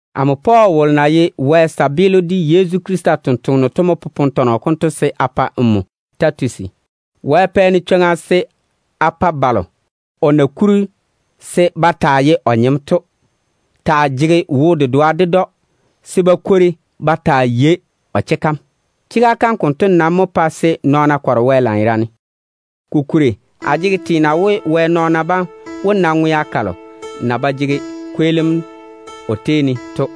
Amo Pɔɔl wolo na ye Wɛ kabaa de Yezu Krista totoŋa nakwe to mo popone tɔnɔ konto se a pa nmo Titusi. Wɛ pɛ-ne chwoŋa se a pa balo o na kuri se ba taa ye o nyem to taa jege wo-dedoa ded‑o, se ba kwori ba taa yei o chega kam. Chega kam konto nam mo pae se nɔɔna kɔre Wɛ lanyerane, kolo ŋwaane ba jege teena we, ba wó na ŋwea kalo na ba jege kweelim o tei ne to.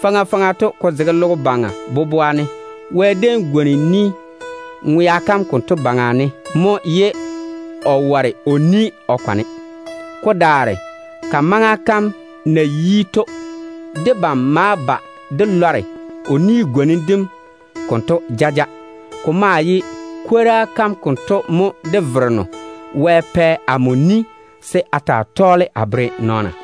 Faŋa faŋa to, ko zege logo baŋa boboa ne, Wɛ déem tiŋi o ni ŋwea kam konto baŋa ne mo, ye o ware o ni o kwane. Ko daare ka maŋa kam na yi to, debam ma ba dé lɔre o ni-gwonim dem konto jaja. Ko maa ye kwora kam konto mo dé Vereno Wɛ pɛ amo ni se a taa tɔɔle a bere nɔɔna.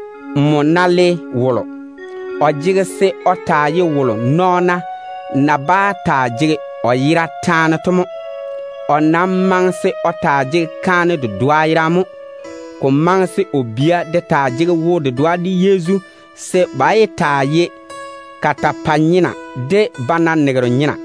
Nmo ná kuri wolo, o jege se o taa ye wolo nɔɔna na bá taa jege o yera taane to mo. O nam maŋe se o taa jege kaane dedoa yerane mo. Ko maŋe se o bia de taa jege wo-dedoa de Yezu, se nɔɔna yé pa ba ye nɔn-wo-korro de zwabani-nyena.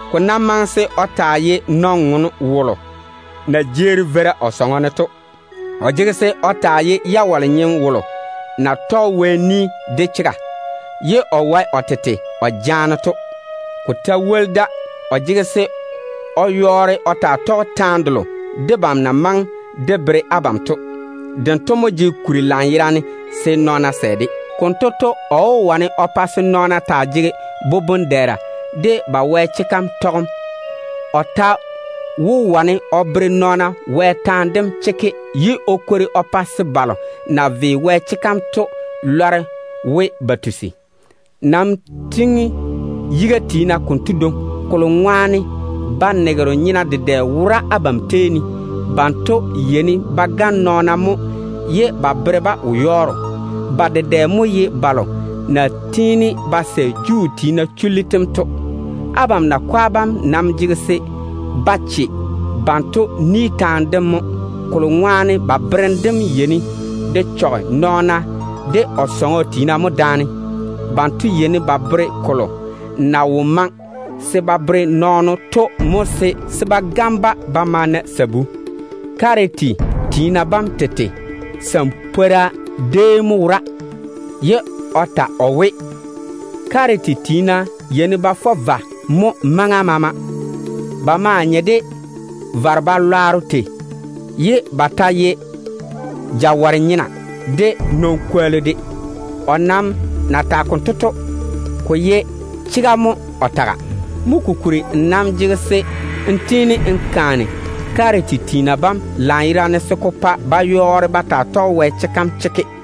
Ko nam maŋe se o taa ye nɔn-ŋom na jeeri veira o sɔŋɔ ne to. O jege se o taa ye jawale-nyem wolo na tɔge Wɛ ni de chega, ye o wae o tete o jaana to. Ko ta woli da, o jege se o yɔɔre o taa tɔge taane delo debam na maŋe de bere abam to. Dento mo jege kuri lanyerane se nɔɔna sɛ-de. Konto to, o wó wane o pa se nɔɔna taa jege boboŋ-dɛɛra de ba Wɛ chega kam tɔgem. O ta wó wane o bere nɔɔna Wɛ taane dem chekke, ye o kwori o pa se balo na ve Wɛ chega kam to lɔre we ba tusi. Nam tiŋi yiga tiina konto dwoŋi, kolo ŋwaane zwabani-nyena dedɛ wora abam tei ne. Banto yeini ba gane nɔɔna mo ye ba bere-ba wo-yɔɔro. Ba dedɛ mo ye balo na tiini ba sɛ Juu tiina chullu tem to. Abam nam jege se á che banto ni taane dem mo, kolo ŋwaane ba berem dem yeini de chɔge nɔɔno de o sɔŋɔ tiina mo daane. Ba yeini ba bere kolo na wo maŋe se ba bere nɔɔna to mo, se ba gane-ba ba ma na sabu. Kiriti tiina bam tete sampwora déem mo wora, ye o ta o we, “Kiriti tiina yeini ba fɔ vwa mo maŋa maama. Ba maa nye de vare-balwaaro tei, ye ba ta ye jawɔre-nyena de nɔn-kwollu de.” O nam na tage konto to, ko ye chega mo o taga. Mo kokuri nmo nam jege se n tiini n kaane Kiriti tiina bam lanyerane se ko pa ba yɔɔre ba taa tɔge Wɛ chega kam chekke,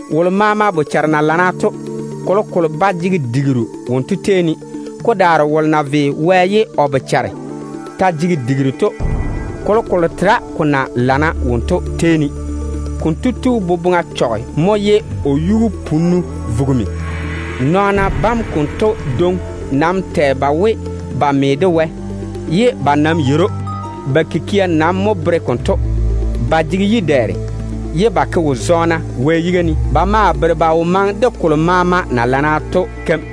Wolo maama na jege wo-pwoŋo to, kolokolo ba jege digiru wonto tei ne. Ko daare wolo na ve Wɛ ye o bochare ta jege digiru to, kolokolo tera ko na lana wonto tei ne. Konto tu boboŋa chɔge mo ye o yu-punnu vugimi. Nɔɔna bam konto dwoŋi nam tɛ ba we ba me de Wɛ, ye ba nam yeiri‑o. Ba kikia nam mo bere konto. Ba jege yi-dɛɛre, ye ba ke wo-zɔɔna Wɛ yiga ne. Ba ma bere ba wo maŋe de kolo maama na lana to keim.